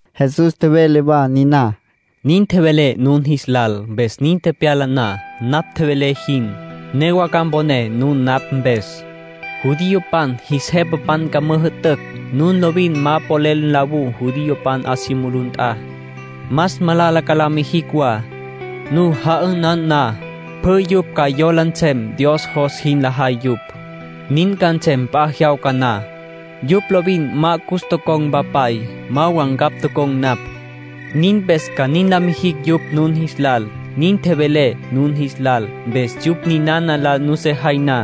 Jesús tjevele wa niná: —Nin tjevelé nun jis lal, mpes nin tepyala na, napj tjevelé jin, newa ca mponé nun napj mpes. Judiopan jis jepapan ca müjü'tücj nun lovin ma polel nlawú judiopan 'a si mulú nt'a. Más malala ca la mijicj wa. Nu ja'ünan na, pjü yupj ca yola nsem Dios jos jin lajay yupj. Nin ca nsem p'a jyawca na. Yupj lovin ma cus tocon̈ Mpapay, ma wa ncapj tocon̈ napj. Nin mpes ca nin la mijicj yupj nun jis lal. Nin tjevelé nun jis lal, mpes yupj ninana la nusejay na,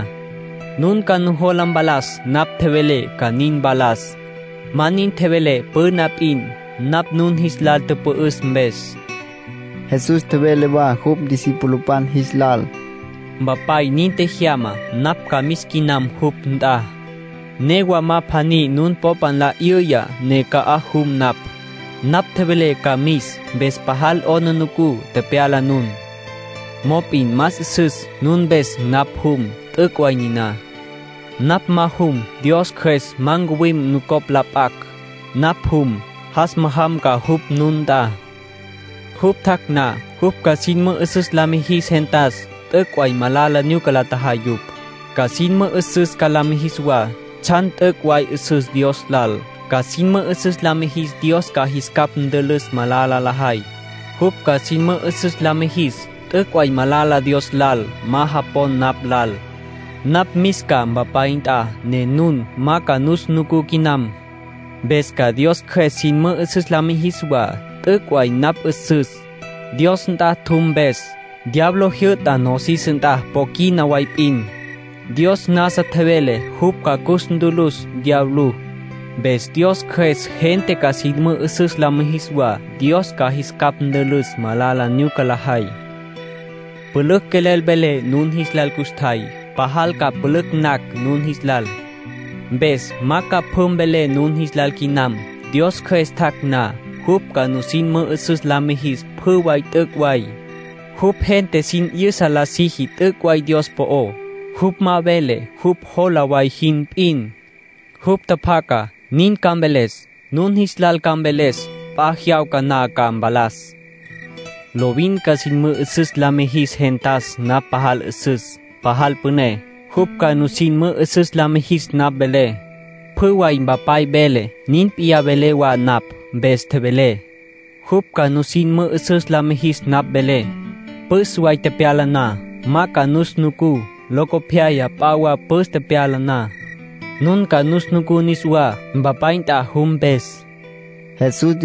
nun ca nujola mpalas napj tjevelé ca nin mpalas. Ma nin tjevelé püna p'in, napj nun jis lal tüpü'üs mpes. Jesús tjevele wa jupj discipulopan jis lal: —Mpapay nin tjejyama. Napj ca mis quinam jupj nt'a. Newa ma pjaní nun popé nla 'yüya ne ca'aj jum napj. Napj tjevelé ca mis, mpes pajal 'aplijila nu tepyala nun. Mop'in más 'üsüs nun mpes napj jum. T'üc' way niná. Napj ma jum, Dios Cjües ma ncuwim nucopj la p'acj. Napj jum, jas majam ca jupj nun nt'a. Jupj tjac' na, jupj ca sin mü'üsüs la mijis gentas t'üc' way malala nyuca la tjajay yupj. Ca sin mü'üsüs la mijis wa tsjan t'üc' way 'üsüs Dios lal. Ca sin mü'üsüs la mijis Dios ca jis capj ntülüs malala lajay. Jupj ca sin mü'üsüs la mijis t'üc' way malala Dios lal ma japon napj lal. ”Napj mis ca Mpapay nt'a, ne nun ma ca nus nucú quinam. Mpes ca Dios Cjües sin mü'üsüs la mijis wa t'üc' way napj 'üsüs, Dios nt'a tjum mpes. Diablo jyü'ta nosis nt'a po quina way p'in; Dios nasa tjevele jupj ca cus ntülüs diablú. Mpes Dios Cjües gente ca sin mü'üsüs la mijis wa Dios ca jis capj ntülüs malala nyuca lajay. ”Pülücj quelel velé nun jis lal custjay, pajal ca pülücj nacj nun jis lal. Mpes ma ca pjü mvelé nun jis lal quinam. Dios Cjües tjac' na, jupj ca nusin mü'üsüs la mijis pjü way t'üc' way. Jupj gente sin 'yüsa la siji t'üc' way Dios po'ó. Jupj ma vele jupj jola way jin p'in. Jupj tjapjacá, nin ca mveles. Nun jis lal ca mveles p'a jyawca na ca mpalas. Lovin ca sin mü'üsüs la mijis gentas napj pajal 'üsüs, pajal püné. Jupj ca nusin mü'üsüs la mijis napj velé. Pjü way Mpapay vele, nin p'iyá velé wa napj. Mpes tjevelé: ‘Jupj ca nusin mü'üsüs la mijis napj velé’. ”Püs way tepyala na, ma ca nus nucú. Locopyaya p'a wa püs tepyala na, nun ca nus nucú niswá, Mpapay nt'a jum mpes —nin tjevele Jesús.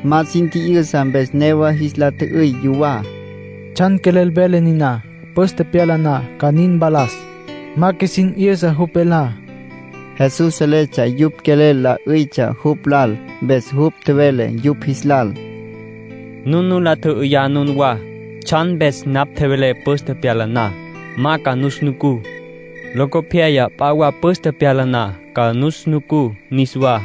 Ma sin tji'yüsa mpes newa jis la tjü'üy yuwá: “¿Tsjan quelel vele niná: ‘püs tepyala na’ ca nin mpalas? Ma qjuisin 'yüsa jupj velá.” Jesús seletsja yupj quelel la 'üytsja jupj lal. Mpes jupj tjevele yupj jis lal: —Nun nu la tjü'üyá nunwá tsjan mpes napj tjevelé püs tepyala na, ma ca nus nucú. Locopyaya p'a wa püs tepyala na, ca nus nucú niswá.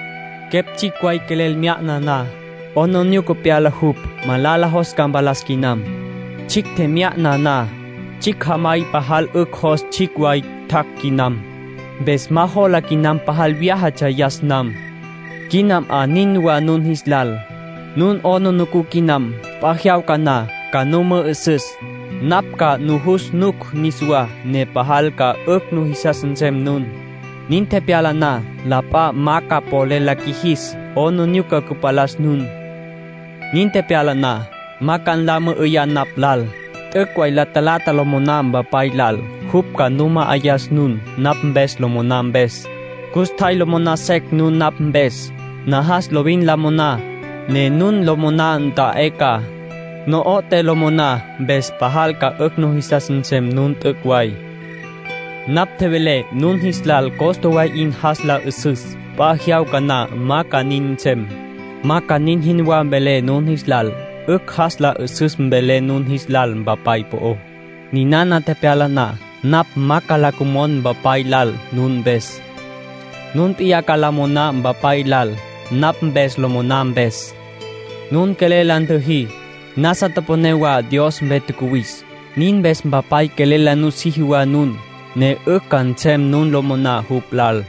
Quepj tsjicj way quelel mya'na na, 'aplijila pyala jupj malala jos ca mpalas quinam. Tsjicj tjemya'na na, 'ücj. Tsjicj jamay pajal 'ücj jos tsjicj way tjac' quinam. Mpes ma jola quinam pajal vyájatsja yas nam. Quina 'a nin wa nun jis lal. Nun 'aplijila quinam. P'a jyawca na ca nu mü'ü'süs. Napj ca nujus nuc niswá, ne pajal ca 'ücj nujisas nsem nun. Nin tepyala na, la p'a ma ca polel la qjuijis 'aplijila cüpalas nun. ”Nin tepyala na, ma ca nla mü'üyá napj lal. T'üc' way la talata lo moná Mpapay lal, jupj ca nu ma'ayas nun, napj mpes lo moná mpes. Custjay lo moná secj nun napj mpes. Najas lovin la moná, ne nun lo moná nta'é ca. No'oté lo moná, mpes pajal ca 'ücj jisas nsem nun t'üc' way. ”Napj tjevelé nun jis lal costa way 'in jas la 'üsüs. P'a jyawca na ma ca nin nsem. Ma ca nin jinwá velé nun jis lal. 'Ücj jas la 'üsüs mvelé nun jis lal Mpapay po'ó. Ninana tepyala na, napj ma ca la cümon Mpapay lal nun mpes. Nun p'iyá ca la moná Mpapay lal, napj mpes lo moná mpes. Nun quelel la ntüjí. Nasa toponé wa Dios mpe tjacuwis. Nin mpes Mpapay quelel la nusiji wa nun, ne 'ücj ca nsem nun lo moná jupj lal.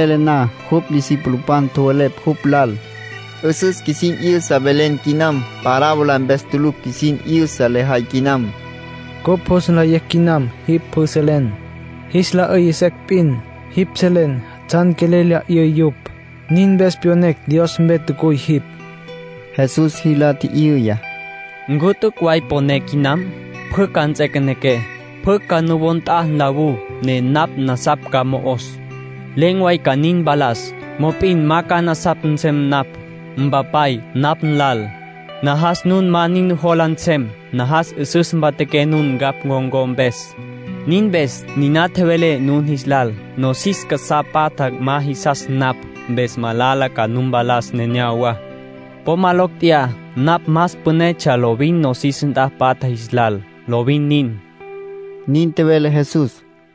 Nin tjevele na, jupj discipulopan tjowelepj jupj lal: —'Üsüs qjuisin 'yüsa velen quinam. Parábola mpes tulucj qjuisin 'yüsa lejay quinam. Cupj jus nlayecj quinam jipj pjü selen. Jis la 'üy secj p'in, jipj selen tsjan quelel lya 'üy yupj. Nin mpes pyonecj Dios mpe tjacuy jipj. Jesús jis la tji'yüya: —¿Ncu t'üc' way poné quinam? Pjü ca nts'equenequé. Pjü ca nuwó nt'a nlawú, ne napj nasapj ca mo'os. Len̈ way ca nin mpalas. Mop'in ma ca nasapj nsem napj, Mpapay napj nlal. Najas nun ma nin nujola nsem; najas 'üsüs mpatjaqué nun ncapj con̈có mpes. Nin mpes niná tjevelé nun jis lal. Nosis casá patja ma jisas napj, mpes malala ca nu mpalas neneyawá. Po ma locj tjeyá. Napj más pünetsja lovin nosis nt'a patja jis lal. Lovin nin —nin tjevele Jesús.